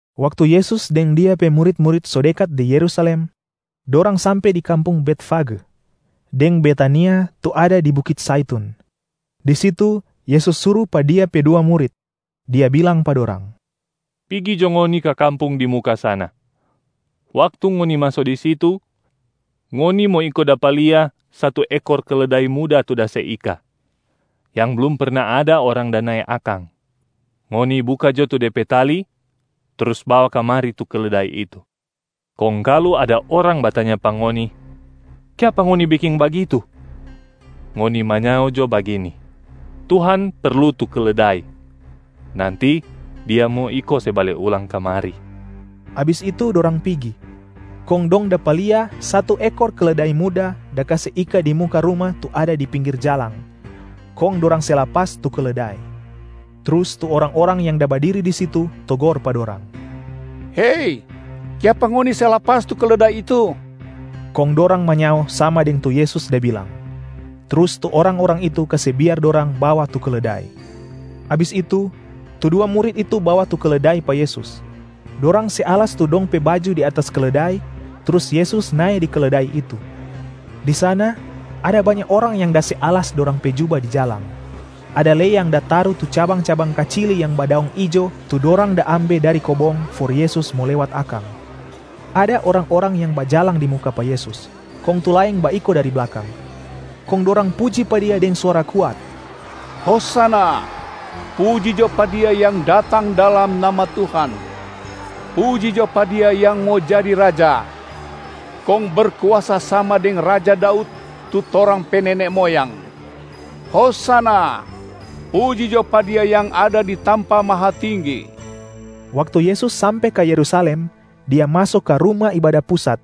Waktu Yesus deng Dia pe murit-murit so dekat di Yerusalem, dorang sampe di kampung Betfage deng Betania tu ada di bukit Zaitun. Di situ Yesus suru pa Dia pe dua murit, Dia bilang pa dorang, “Pigi jo ngoni ka kampung di muka sana. Waktu ngoni maso di situ, ngoni mo iko dapa lia satu ekor keledai muda tu da se ika, yang blum perna ada orang da nae akang. Ngoni buka jo tu de pe tali trus bawa kamari tu keledai itu. Kong kalu ada orang batanya pa ngoni, ‘Kiapa ngoni beking bagitu?’ Ngoni manyao jo bagini, ‘Tuhan perlu tu keledai, nanti Dia mo iko se bale ulang kamari.’” Abis itu dorang pigi, kong dong dapa lia satu ekor keledai muda da kase ika di muka ruma tu ada di pinggir jalang. Kong dorang se lapas tu keledai. Trus tu orang-orang yang da badiri di situ togor pa dorang, “Hei! Kiapa ngoni se lapas tu keledai itu?” Kong dorang manyao sama deng tu Yesus da bilang, trus tu orang-orang itu kase biar dorang bawa tu keledai. Abis itu, tu dua murit itu bawa tu keledai pa Yesus. Dorang se alas tu dong pe baju di atas keledai, trus Yesus nae di keledai itu. Di sana ada banya orang yang da se alas dorang pe juba di jalang. Ada lei yang da taru tu cabang-cabang kacili yang badaong ijo tu dorang da ambe dari kobong, for Yesus mo lewat akang. Ada orang-orang yang bajalang di muka pa Yesus kong tu laeng baiko dari blakang, kong dorang puji pa Dia deng suara kuat, “Hosana! Puji jo pa Dia yang da datang dalam nama Tuhan. Puji jo pa Dia yang mo jadi Raja, kong berkuasa sama deng raja Daud tu torang pe nene moyang. Hosana! Puji jo pa Dia yang ada di tampa mahatinggi!” Waktu Yesus sampe ka Yerusalem, Dia maso ka Ruma Ibada Pusat.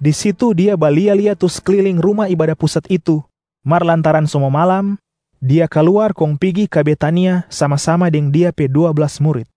Di situ Dia balia-lia tu sekliling Ruma Ibada Pusat itu, mar lantaran so mo malam, Dia kaluar kong pigi ka Betania sama-sama deng Dia pe dua blas murit.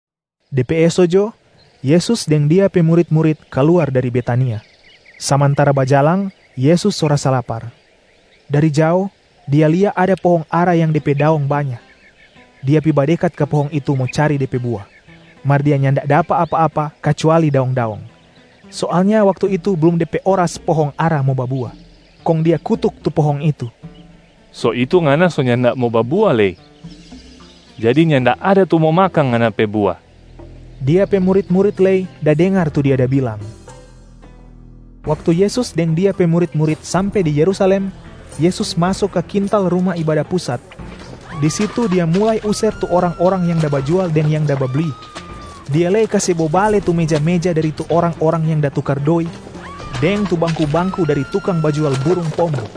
De pe eso jo, Yesus deng Dia pe murit-murit kaluar dari Betania. Samantara bajalang, Yesus so rasa lapar. Dari jao Dia lia ada pohong ara yang de pe daong banya. Dia pi badekat ka pohong itu mo cari de pe bua, mar Dia nyanda dapa apa-apa kacuali daong-daong. Soalnya waktu itu blum de pe oras pohong ara mo babua. Kong Dia kutuk tu pohong itu, “So itu ngana so nyanda mo babua lei, jadi nyanda ada tu mo makang ngana pe bua!” Dia pe murit-murit lei da dengar tu Dia da bilang. Waktu Yesus deng Dia pe murit-murit sampe di Yerusalem, Yesus maso ka kintal Ruma Ibada Pusat. Di situ Dia mulai user tu orang-orang yang da bajual deng yang da babli, Dia lei kase bobale tu meja-meja dari tu orang-orang yang da tukar doi deng tu bangku-bangku dari tukang bajual burung pombo.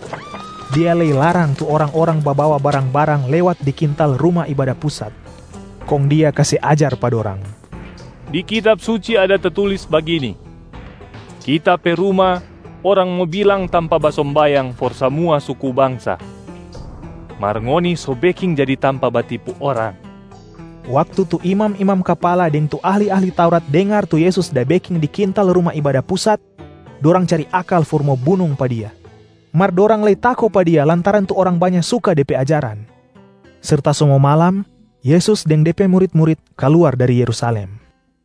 Dia lei larang tu orang-orang babawa barang-barang lewat di kintal Ruma Ibada Pusat. Kong Dia kase ajar pa dorang, “Di Kitab Suci ada tatulis bagini, ‘Kita pe ruma orang mo bilang tampa basombayang for samua suku bangsa.’ Mar ngoni so beking jadi tampa batipu orang!” Waktu tu imam-imam kapala deng tu ahli-ahli Taurat dengar tu Yesus da beking di kintal Ruma Ibada Pusat, dorang cari akal for mo bunung pa Dia. Mar dorang lei tako pa Dia lantaran tu orang banya suka De pe ajaran. Serta so mo malam, Yesus deng De pe murit-murit kaluar dari Yerusalem.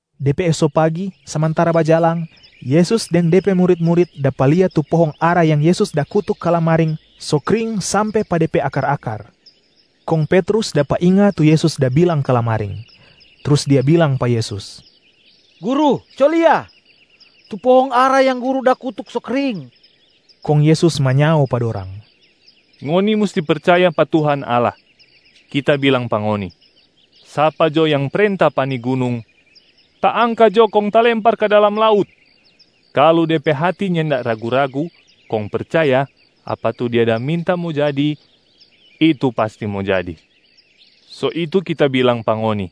De pe eso pagi, samantara bajalang, Yesus deng De pe murit-murit dapa lia tu pohong ara yang Yesus da kutuk kalamaring so kring sampe pa de pe akar-akar. Kong Petrus dapa inga tu Yesus da bilang kalamaring, trus dia bilang pa Yesus, “Guru, co lia! Tu pohong ara yang Guru da kutuk so kring.” Kong Yesus manyao pa dorang, “Ngoni musti percaya pa Tuhan Allah. Kita bilang pa ngoni, sapa jo yang prenta pa ni gunung, ‘Taangka jo kong talempar ka dalam laut!’ kalu de pe hati nyanda ragu-ragu kong percaya apa tu dia da minta mo jadi, itu pasti mo jadi. So itu Kita bilang pa ngoni,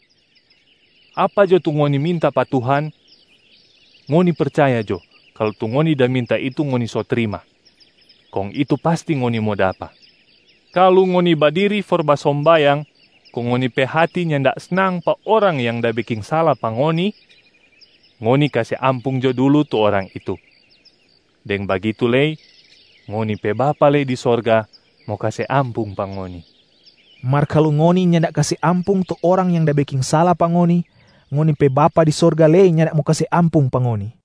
apa jo tu ngoni minta pa Tuhan, ngoni percaya jo kalu tu ngoni da minta itu ngoni so trima, kong itu pasti ngoni mo dapa. Kalu ngoni badiri for basombayang kong ngoni pe hati nyanda snang pa orang yang da beking sala pa ngoni, ngoni kase ampung jo dulu tu orang itu. Deng bagitu lei ngoni pe Bapa lei di sorga mo kase ampung pa ngoni.” [ Mar kalu ngoni nyanda kase ampung tu orang yang da beking sala pa ngoni, ngoni pe Bapa di sorga lei nyanda mo kase ampung pa ngoni.]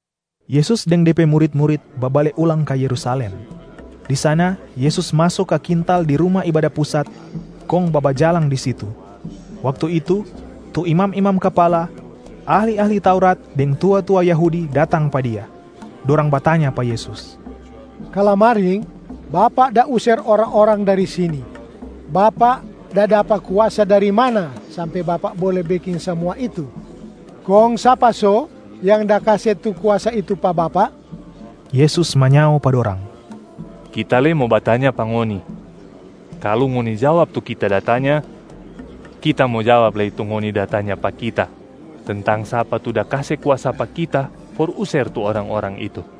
Yesus deng De pe murit-murit babale ulang ka Yerusalem. Di sana Yesus maso ka kintal di Ruma Ibada Pusat kong babajalang di situ. Waktu itu, tu imam-imam kapala, ahli-ahli Taurat deng tua-tua Yahudi datang pa Dia. Dorang batanya pa Yesus, “Kalamaring, Bapak da user orang-orang dari sini. Bapak da dapa kuasa dari mana sampe Bapak bole beking samua itu? Kong sapa so yang da kase tu kuasa itu pa Bapak?” Yesus manyao pa dorang, “Kita lei mo batanya pa ngoni. Kalu ngoni jawab tu Kita da tanya, Kita mo jawab lei tu ngoni da tanya pa Kita tentang sapa tu da kase kuasa pa Kita for user tu orang-orang itu.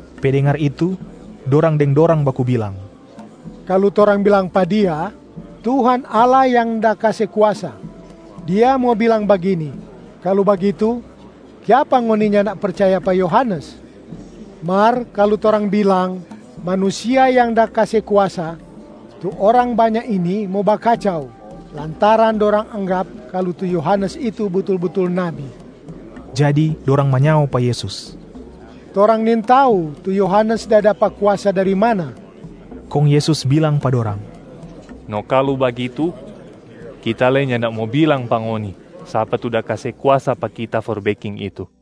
Pe dengar itu, dorang deng dorang baku bilang, “Kalu torang bilang pa Dia, ‘Tuhan Allah yang da kase kuasa’, Dia mo bilang bagini, ‘Kalu bagitu, kiapa ngoni nyanda percaya pa Yohanes?’ Mar, kalu torang bilang, ‘Manusia yang da kase kuasa’, tu orang banya ini mo bakacau, lantaran dorang anggap kalu tu Yohanes itu butul-butul nabi.” Jadi dorang manyao pa Yesus, “Torang nintau tu Yohanes da dapa kuasa dari mana!” Kong Yesus bilang pa dorang, “No kalu bagitu, Kita lei nyanda mo bilang pa ngoni sapa tu da kase kuasa pa Kita for beking itu.”